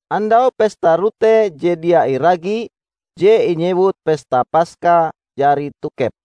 Andau Pesta Rote Je Dia Iragi je inyewut Pesta Paska jari tokep.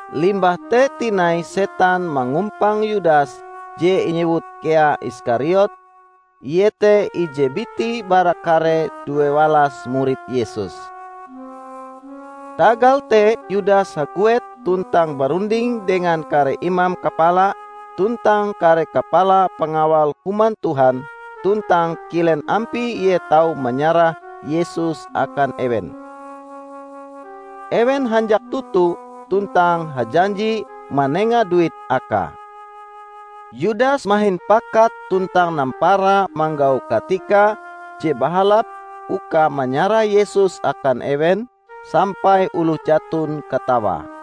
Limbah te tinai setan mangumpang Yudas je inyewut kea Iskariot, iete ije biti bara kare duewalas murid Yesus. Tagal te Yudas haguet tuntang barunding dengan kare imam kapala tuntang kare kapala pangawal Human Tuhan tuntang kilen ampie ie tau manyarah Yesus akan ewen. Ewen hanjak toto tuntang hajanji manenga duit akae. Yudas mahin pakat tuntang nampara manggau katika je bahalap uka manyarah Yesus akan ewen, sampai oloh jaton katawae.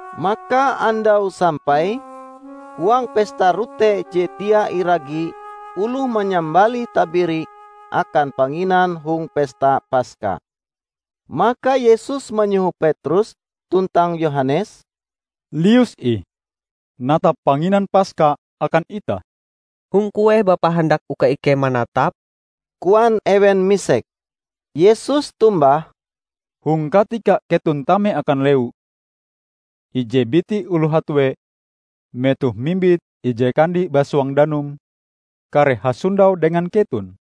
Maka andaue sampai, huang Pesta Rote Je Dia Iragi oloh manyambalih tabiri akan panginan hong pesta Paska. Maka Yesus manyoho Petrus tuntang Yohanes, "Lius ih natap panginan Paska akan itah." "Hong kueh Bapa handak uka ikei manatape?" koan ewen misek. Yesus tombah, "Hong katika keton tame akan lewu, ije biti oloh hatue metohe mimbit ije kandi basuang danum kareh hasondau dengan keton.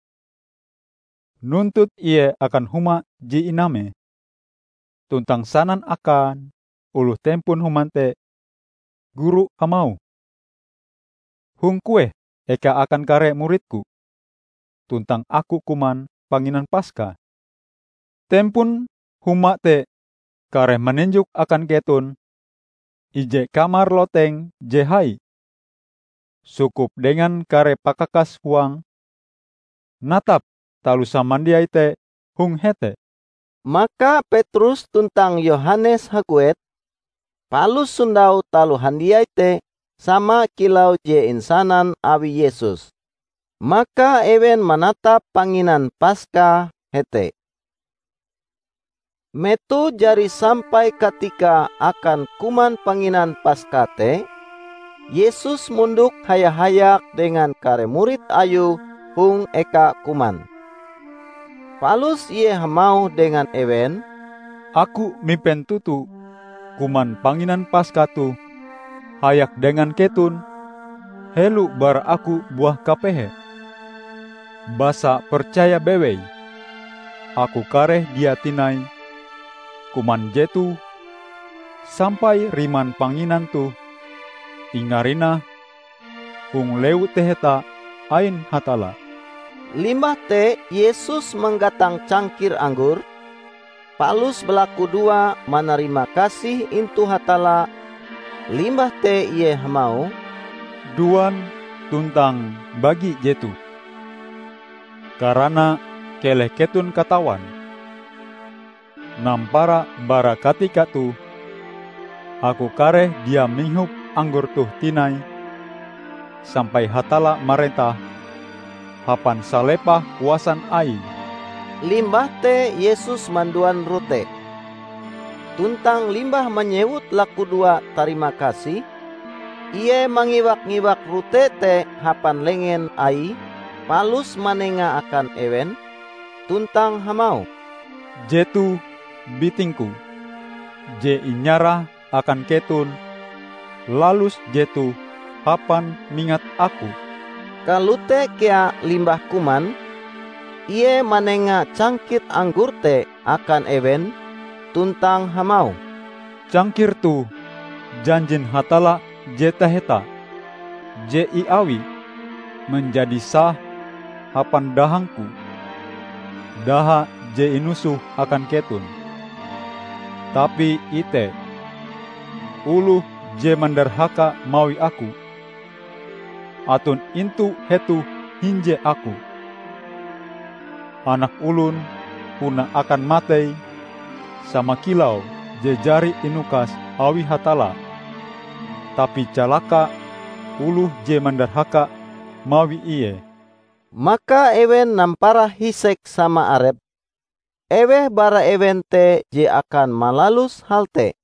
Nuntut ie akan huma je inamee, tuntang sanan akan oloh tempon huma te: Guru hamauh: 'Hong kueh eka akan kare murid-Ku tuntang Aku kuman panginan Paska?' Tempon huma te kareh maninjok akan keton ije kamar loteng je hai, sukup dengan kare pakakas huange. Natap taloh samandiai te hong hete." Maka Petrus tuntang Yohanes haguet, palus sondau taloh handiai te sama kilau je insanan awi Yesus. Maka ewen manatap panginan Paska hete. Metoh jari sampai katikae akan kuman panginan Paska te, Yesus mondok haya-hayak dengan kare murid Ayue hong eka kuman. Palus ie hamauh dengan ewen, "Aku mipen toto kuman panginan Paska toh hayak dengan keton helo bara Aku buah kapehe! Basa, percaya bewei: Aku kareh dia tinai kuman jetoh sampai riman panginan toh ingarinah hong Lewu Taheta ain Hatalla." Limbah te Yesus manggatang cangkir anggor, palus balakudoa manarimakasih inatu Hatalla, limbah te Ie hamauh, "Duan, tuntang mbagi jetoh; karana keleh keton katawan: nampara bara katika toh Aku kareh dia mihop anggor toh tinai sampai Hatalla marentah hapan salepah kuasan Aie." Limbah te Yesus manduan rote. Tuntang limbah manyewut lakudoa tarimakasih, Ie mangiwak-mangiwak rote te hapan lengen Aie palus manengae akan ewen, tuntang hamauh, "Jetoh biting-Ku [je inyarah akan keton. Lalus jetoh hapan mingat Aku." Kalote kea limbah kuman, Ie manenga cangkir anggor te akan ewen tuntang hamauh, "Cangkir toh janjin Hatalla je taheta, je iawi manjadi sah hapan dahang-Ku -- daha je inusoh akan keton."] "Tapi ite! Oloh je mandarhaka mawi Aku aton intu hetoh hinje Aku! Anak Olon puna akan matei sama kilau je jari inukas awi Hatalla; tapi calaka oloh je mandarhaka mawi Ie!" Maka ewen nampara hisek sama arepe, eweh bara ewen te je akan malalus hal te.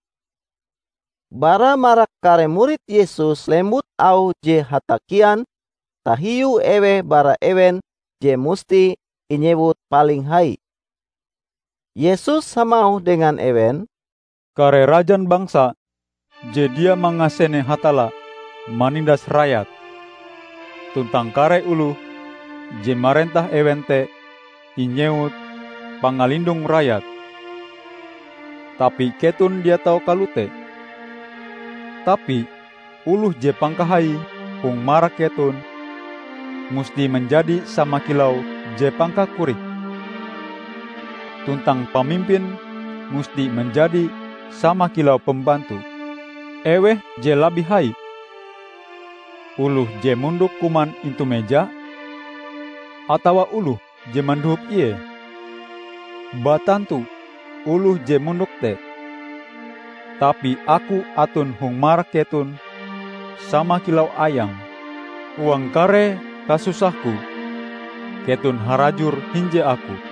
Bara marak kare murid Yesus lembut auh je hatakian tahiu eweh bara ewen je musti inyewut paling hai. Yesus hamauh dengan ewen, "Kare rajan bangsa je dia mangasene Hatalla manindas rayate, tuntang kare oloh je marentah ewen te inyewut 'Pangalindong Rayat'. Tapi keton dia tau kalote. Tapi, oloh je pangkahaie hong marak keton musti manjadi sama kilau je pangkakorike, tuntang pamimpin musti manjadi sama kilau pembantu. Eweh je labih hai: oloh je mondok kuman intu meja, atawa oloh je mandohop ie? Batantu oloh je mondok te. Tapi Aku aton hong marak keton sama kilau ayang. Huang kare kasusah-Ku, keton harajur hinje Aku.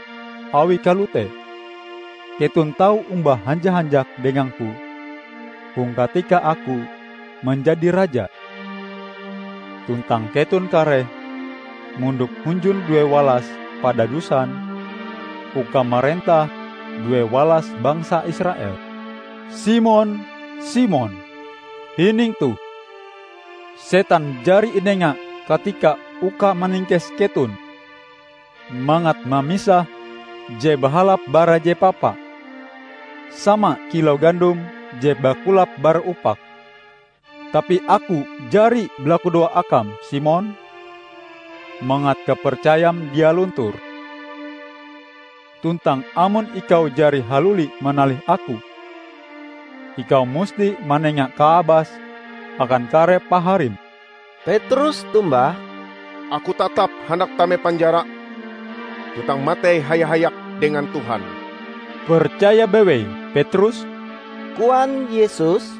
Awi kalote keton tau omba hanja-hanjak dengang-Ku hong katika Aku manjadi Raja. Tuntang keton kareh mondok hunjun duewalas padadusan uka marentah duewalas bangsa Israel." "Simon, Simon, hining toh! Setan jari inenga katika uka maningkes keton; mangat mamisah je bahalap bara je papa; sama kilau gandom je bakulap bara upake. Tapi Aku jari balakudoa akam, Simon, mangat kapercayam dia luntur. Tuntang amon ikau jari haluli manalih Aku, ikau musti manenga kaabas akan kare paharim." Petrus tombah, "Aku tatap handak tame penjara tuntang matei haya-hayak dengan Tuhan!" "Percaya bewei, Petrus," koan Yesus,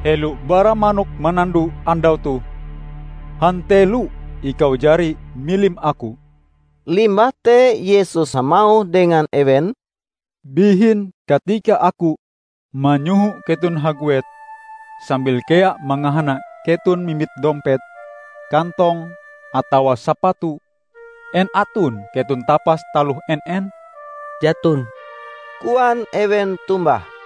"helo bara manok manando andau toh, hantelo ikau jari milim Aku." Limbah te Yesus hamauh dengan ewen, "Bihin katika Aku manyoho keton haguet sambil kea mangahana keton mimbit dompet, kantong, atawa sapatu, en aton keton tapas taloh en-en?" "Jaton!" koan ewen tombah.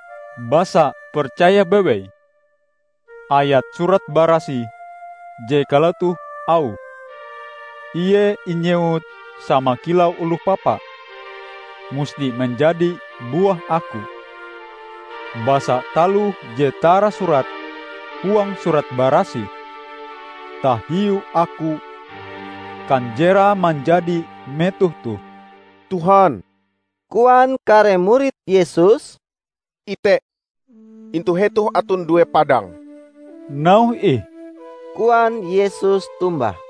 Basa, percaya bewei, ayat Surat Barasih je kalotoh auhe, 'ie inyewut sama kilau oloh papa,' musti manjadi buah Aku. Basa taloh je tarasurat huang Surat Barasih tahiu Aku kanjerae manjadi metoh toh." "Tuhan," koan kare murid Yesus, "ite, intu hetoh aton due padang." "Nauhe ih!" koan Yesus tombah.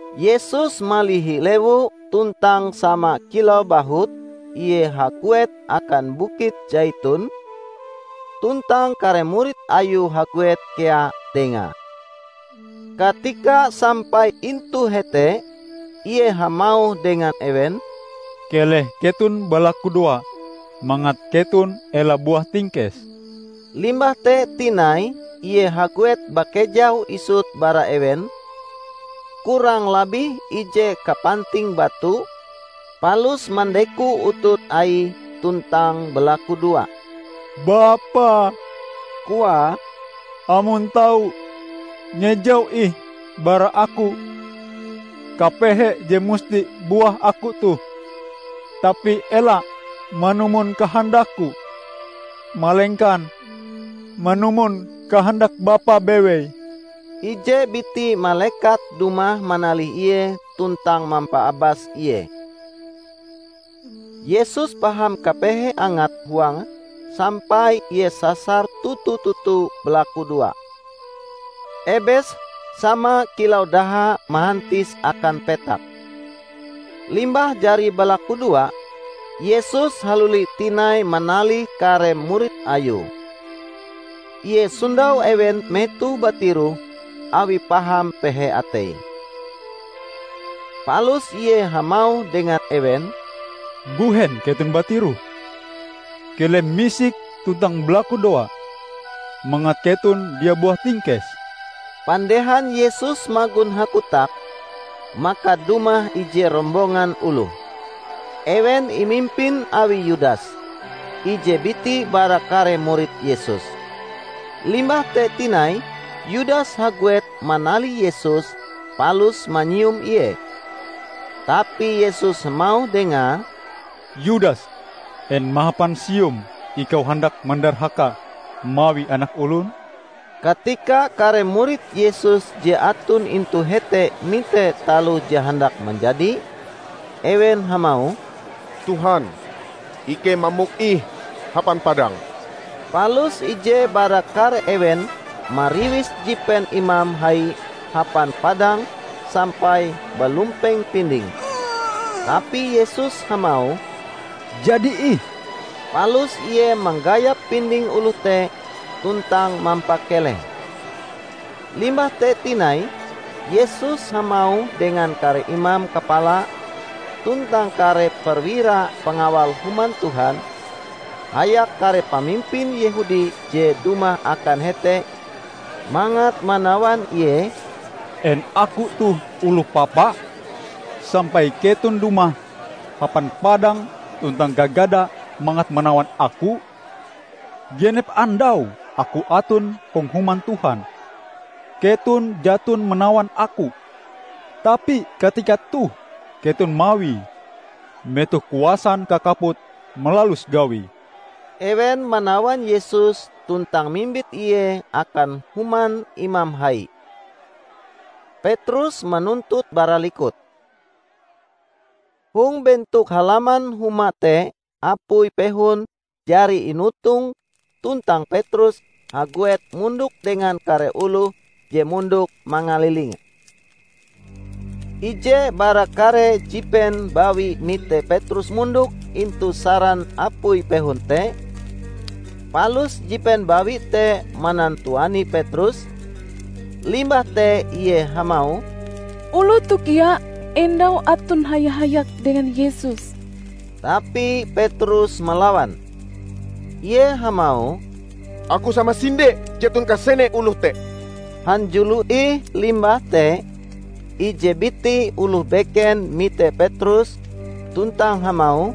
Yesus malihi lewu tuntang sama kilau bahut Ie haguet akan bukit Saiton, tuntang kare murid Ayue haguet kea Dengae. Katika sampai intu hete, Ie hamauh dengan ewen, "Keleh keton balakudoa mangat keton ela buah tingkes." Limbah te tinai ie haguet bakejau isut bara ewen, kurang labih ije kapanting batu, palus mandeko utut Aie tuntang balakudoa. "Bapa," Koae, "amon tau, ngejau ih bara Aku kapehe je musti buah Aku toh. Tapi ela manumon kahandak-Ku, malengkan manumon kahandak Bapa bewei." [ Ije biti malekat dumah manalih Ie tuntang mampaabas Ie. Yesus paham kapehe angat huange sampai ie sasar toto-toto balakudoa. Ebese sama kilau daha mahantis akan petak.] Limbah jari balakudoa, Yesus haluli tinai manalih kare murid Ayue. Ie sondau ewen metohe batiroh awi paham pehe ateie. Palus Ie hamauh dengan ewen, "Mbuhen keton batiroh? Keleh misik tuntang balakudoa mangat keton dia buah tingkes." Pandehan Yesus magon hakotak, maka dumah ije rombongan oloh. Ewen imimpin awi Yudas, ije biti bara kare murid Yesus. Limbah te tinai Yudas haguet manalih Yesus palus manyium Ie. Tapi Yesus hamauh dengae, "Yudas, en mahapan sium ikau handak mandarhaka mawi Anak Olon?" Katika kare murid Yesus je aton intu hete mite taloh je handak manjadi, ewen hamauh, "Tuhan, ikei mamok ih hapan padang!" Palus ije bara kare ewen mariwis jipen imam hai hapan padang sampai balumpeng pindinge. Tapi Yesus hamauh, "Jadi ih!" Palus Ie manggayap pinding oloh te tuntang mampakelehe. Limbah te tinai Yesus hamauh dengan kare imam kapala tuntang kare perwira pangawal Human Tuhan, hayak kare pamimpin Yehudi je dumah akan hete mangat manawan Ie, "En Aku toh oloh papa, sampai keton dumah hapan padang tuntang gagada mangat manawan Aku? Genep andau Aku aton hong Human Tuhan, keton jaton manawan Aku. Tapi katika toh keton mawie, metoh kuasan kakaput malalus gawie." Ewen manawan Yesus tuntang mimbit Ie akan human imam hai. Petrus manuntut bara likut. Hong bentok halaman huma te apui pehon jari inotong tuntang Petrus haguet mondok dengan kare oloh je mondok mangalilinge. Ije bara kare jipen bawi mite Petrus mondok intu saran apui pehon te; palus jipen bawi te manantuani Petrus, limbah te Ie hamauh, "Oloh toh kea endau aton haya-hayak dengan Yesus!" Tapi Petrus malawan. Ie hamauh, "Aku samasinde jaton kasene oloh te!" Hanjulo ih limbah te, ije biti oloh beken mite Petrus tuntang hamauh,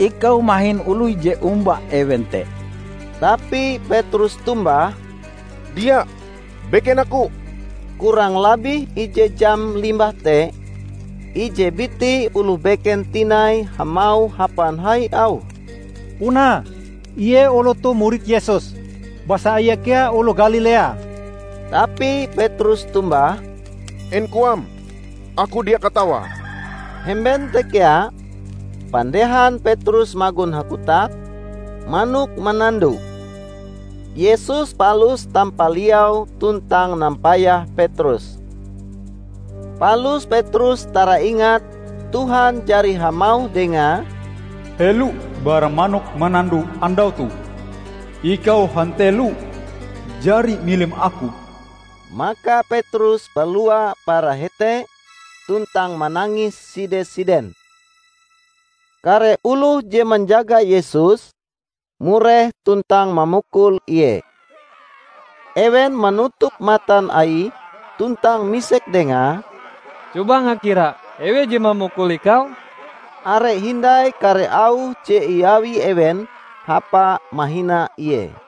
"Ikau mahin oloh je omba ewen te!" Tapi Petrus tombah, "Dia, beken aku!" Kurang labih ije jam limbah te, ije biti oloh beken tinai hamauh hapan hai auhe, "Puna Ie oloh toh murid Yesus, basa Ie kea oloh Galilea!" Tapi Petrus tombah, "En koam, aku dia katawae!" Hemben te kea, pandehan Petrus magon hakotak, manok manando. Yesus palus tampaliau tuntang nampayah Petrus. Palus Petrus taraingat Tuhan jari hamauh dengae, "Helo bara manok manando andau toh, ikau hantelo jari milim Aku." Maka Petrus balua bara hete tuntang manangis side-siden. Kare oloh je manjaga Yesus, mureh tuntang mamukul Ie. Ewen manutup matan Aie tuntang misek Dengae, "Coba ngakira eweh je mamukul Ikau?" Are hindai kare auh je iawi ewen hapa mahina Ie.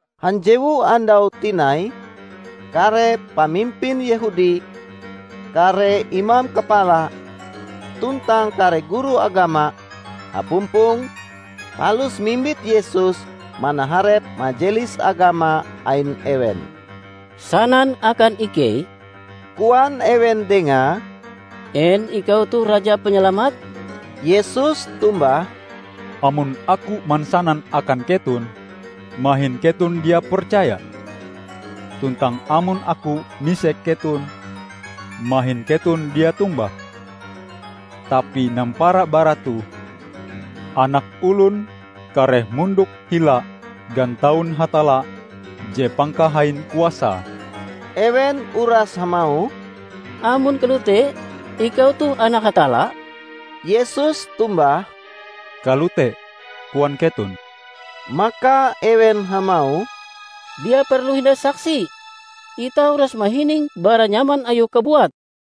Hanjewu andau tinai, kare pamimpin Yehudi, kare imam kapala, tuntang kare guru agama, hapumpong, palus mimbit Yesus manaharep Majelis Agama ain ewen. "Sanan akan ikei," koan ewen Dengae, "en Ikau toh Raja Panyalamat?" Yesus tombah, "Amon Aku mansanan akan keton, mahin keton dia percaya. Tuntang amon Aku misek keton, mahin keton dia tombah. Tapi nampara bara toh, Anak Olon kareh mondok hila gantaun Hatalla je Pangkahain Kuasae." Ewen uras hamauh, "Amon kalote, Ikau toh anak Hatalla?" Yesus tombah, "Kalote koan keton." Maka ewen hamauh, "Dia perlu hindai saksi! Itah uras mahining bara nyaman Ayue kabuat!"